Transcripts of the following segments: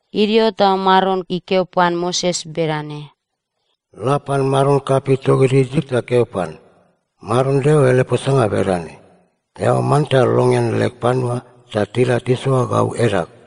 Idio ta Maron ikeo pan Moses bedane, “La pan maron kapei togid Isip ta keo pan, ‘Maron Deo ele posanga bedane: Eao manta longean leg panua ta tila tisoa gau edag.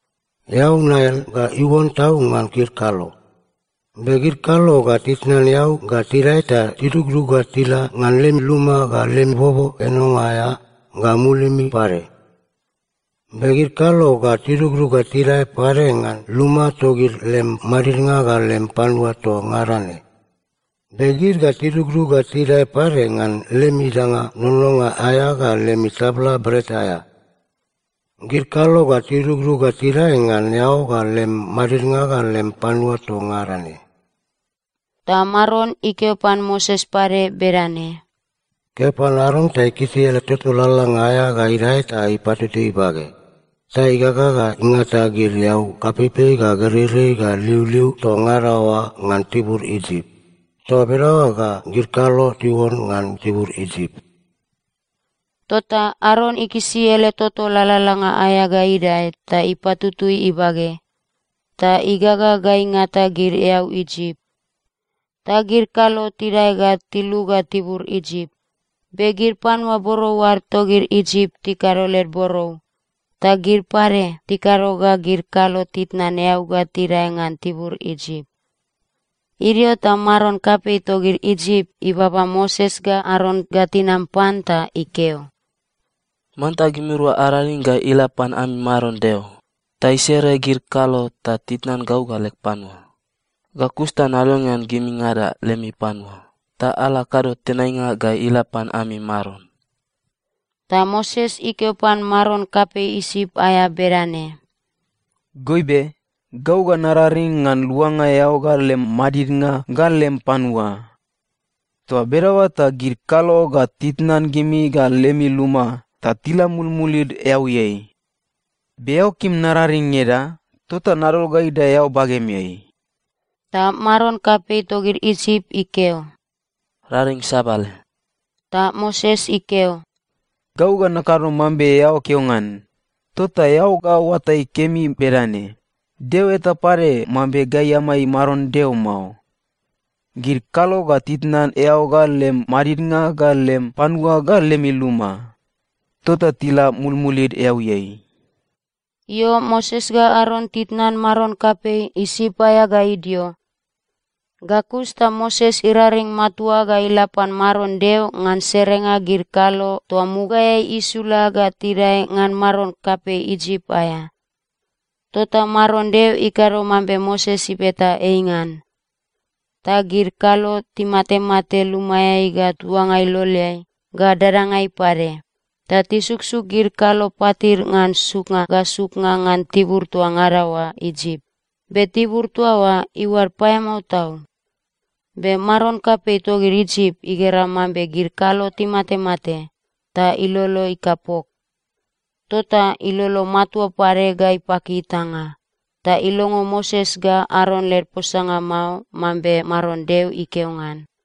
Eau Nail ga iuon tau ngan gid kalo. Be gid kalo ga titnan eau ga tidae ta tidugdug ga tila ngan lem luma ga lem bobo enonga aea ga mulim pade. Be gid kalo ga tidugdug ga tidae pade ngan luma togid lem madidnga ga lem panua toa ngada ne. Be gid ga tidugdug ga tidae pade ngan lemi danga nononga aea ga lemi tabla bret aea. Gid kalo ga tidugdug ga tidae ngan eao ga lem madidnga ga lem panua toa ngada ne.’” Ta Maron ikeo pan Moses pade bedane, “Keo pan Aron ta ikisi ele toto lalalanga aea ga idae ta ipatutui ibage, ta igaga ga ingata gid eau kapeipei ga gereirei ga liuliu toa ngada oa ngan tibur Isip. Toa bedaoa ga gid kalo tiuon ngan tibur Isip.” Tota Aron ikisi ele toto lalalanga aea ga idae ta ipatutui ibage, ta igaga ga ingata gid eau Isip, ta gid kalo tidae ga tiluga tibur Isip. Be gid panua borou ad togid Isip tikado led borou, ta gid pade tikado ga gid kalo titnan eau ga tidae ngan tibur Isip. Idio ta maron kapei togid Isip ibaba Moses ga Aron ga tinam pan ta ikeo, “Manta gimirua araring ga ila pan ami Maron Deo ta isere gid kalo ta titnan gau ga leg panua. Ga kus ta nalongean gimingada lemi panua ta ala akado tenainga ga ila pan ami Maron.” Ta Moses ikeo pan maron kapei Isip aea bedane, “Goibe, gau ga nararing ngan luanga eao ga lem madidnga ga lem panua. Toa bedaoa ta gid kalo ga titnan gimi ga lemi luma, ta tila mulmulid eauiai. Be eao kim nararing ngeda? Tota nadol ga idae eao bagemeai.” Ta maron kapei togid Isip ikeo, “Raring sabale.” Ta Moses ikeo, “Gau ga nakado mambe eao keo ngan, tota eao ga oatai kemi bedane: Deo eta pade mambe gai amai Maron Deo mao. Gid kalo ga titnan eao ga lem madidnga ga lem panua ga lemi luma. Tota tila mulmulid eauiai.” Io, Moses ga Aron titnan maron kapei Isip aea ga idio, ga kus ta Moses iraring matua ga ila pan Maron Deo ngan serenga gid kalo toa mugaeai isula ga tidae ngan maron kapei Isip aea. Tota Maron Deo ikado mambe Moses ibeta ei ngan. Ta gid kalo timatemate lumaeai ga tuanga iloleai ga dadangai pade. Ta tisuksuk gid kalo patid ngan suknga ga suknga ngan tibur toa ngada oa Isip, be tibur toa oa iuad paeamao tau. Be maron kapei togid Isip igera mambe gid kalo timatemate, ta ilolo ikapok. Tota ilolo matua pade ga ipaki itanga. Ta ilongo Moses ga Aron led posanga mao, mambe Maron Deo ikeo ngan.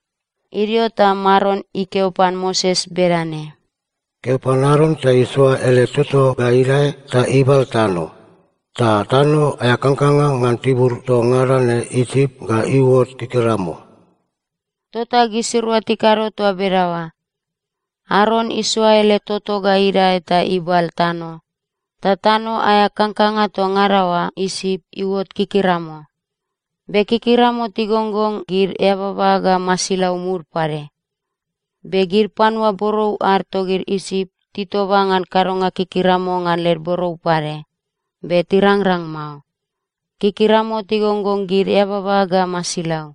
Idio ta Maron ikeo pan Moses bedane, “Keo pan Aron ta isoa ele toto ga idae ta ibal tano, ta tano aea kangkanga ngan tibur toa ngada ne Isip ga iuot kikiramo.” Tota gisirua tikado toa bedaoa. Aron isoa ele toto ga idae ta ibal tano, ta tano aea kangkanga toa ngada oa Isip iuot kikiramo. Be kikiramo tigonggong gid eababa ga masilau mud pade. Be gid panua borou ad togid Isip titoba ngan kadonga kikiramo ngan led borou pade, be tirangrang mao. Kikiramo tigonggong gid eababa ga masilau.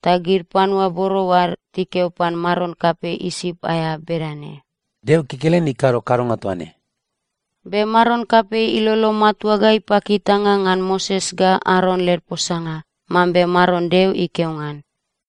Ta gid panua borou ad tikeo pan maron kapei Isip aea bedane, “Deo kekelen ikado kadonga toa ne.” Be maron kapei ilolo matua ga ipaki itanga ngan Moses ga Aron led posanga, mambe Maron Deo ikeo ngan.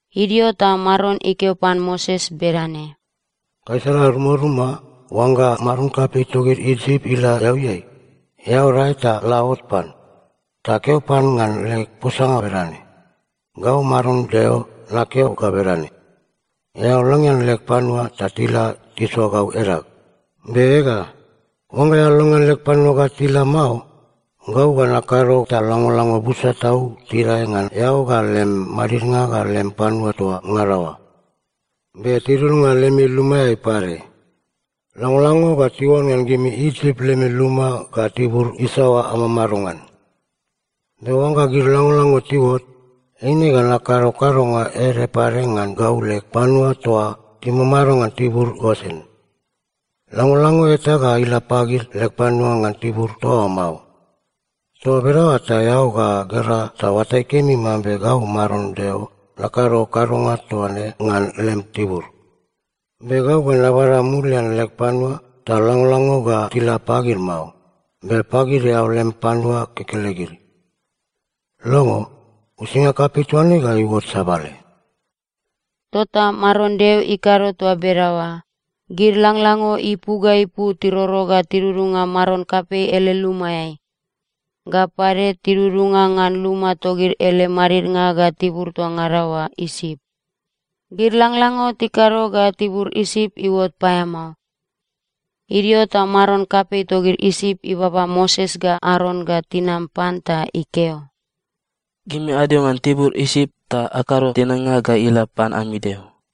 Idio ta Maron ikeo pan Moses bedane, “Gaisala rumaruma, oangga maron kapei togid Isip ila eauiai, eao dae ta la ot pan. Ta keo pan ngan leg posanga bedane, ‘Gau Maron Deo nakeo ga bedane: Eao longean leg panua ta tila tisoa gau edag. Be ega, oangga eao longean leg panua ga tila mao, gau ga nakado ta langlango busa tau tidae ngan eao ga lem madidnga ga lem panua toa ngada oa, be tidudunga lemi lumaeai pade. Langlango ga tiuon ngan gimi Isip lemi luma ga tibur isaoa amamado ngan. “‘Be oangga gid langlango tiuot, eine ga nakado kadonga ede pade ngan gau leg panua toa timamado ngan tibur Gosen. Langlango eta ga ila pagid leg panua ngan tibur toa oa mao. Toa bedaoa ta eao ga gera ta oatai kemi mambe gau Maron Deo nakado kadonga toa ne ngan lem tibur. Be gau ga nabada mulian leg panua, ta langlango ga tila pagid mao, be pagid eao lem panua kekelegid. Longo, uisinga kapei toa ne ga iuot sabale.’” Tota Maron Deo ikado toa bedaoa. Gid langlango ipu ga ipu tiroro ga tidudunga maron kapei ele lumaeai. Ga pade tidudunga ngan luma togid ele madidnga ga tibur toa ngada oa Isip. Gid langlango tikado ga tibur Isip iuot paeamao. Idio ta maron kapei togid Isip ibaba Moses ga Aron ga tinam pan ta ikeo, “Gimi adio ngan tibur Isip ta akado tenainga ga ila pan ami Deo.”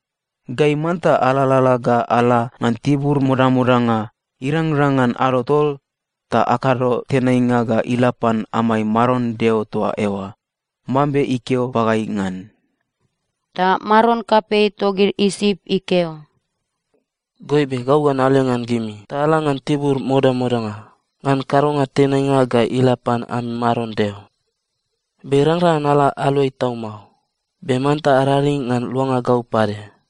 Gai manta alalala ga ala ngan tibur modamodanga irangrang ngan ado tol ta akado tenainga ga ila pan amai Maron Deo toa eoa, mambe ikeo pagai ngan.” Ta maron kapei togid Isip ikeo, “Goibe, gau ga nalongean gimi ta ala ngan tibur modamodanga ngan kadonga tenainga ga ila pan ami Maron Deo, be irangrang ngan ala aluai tau mao. Be manta araring ngan luanga gau pade.”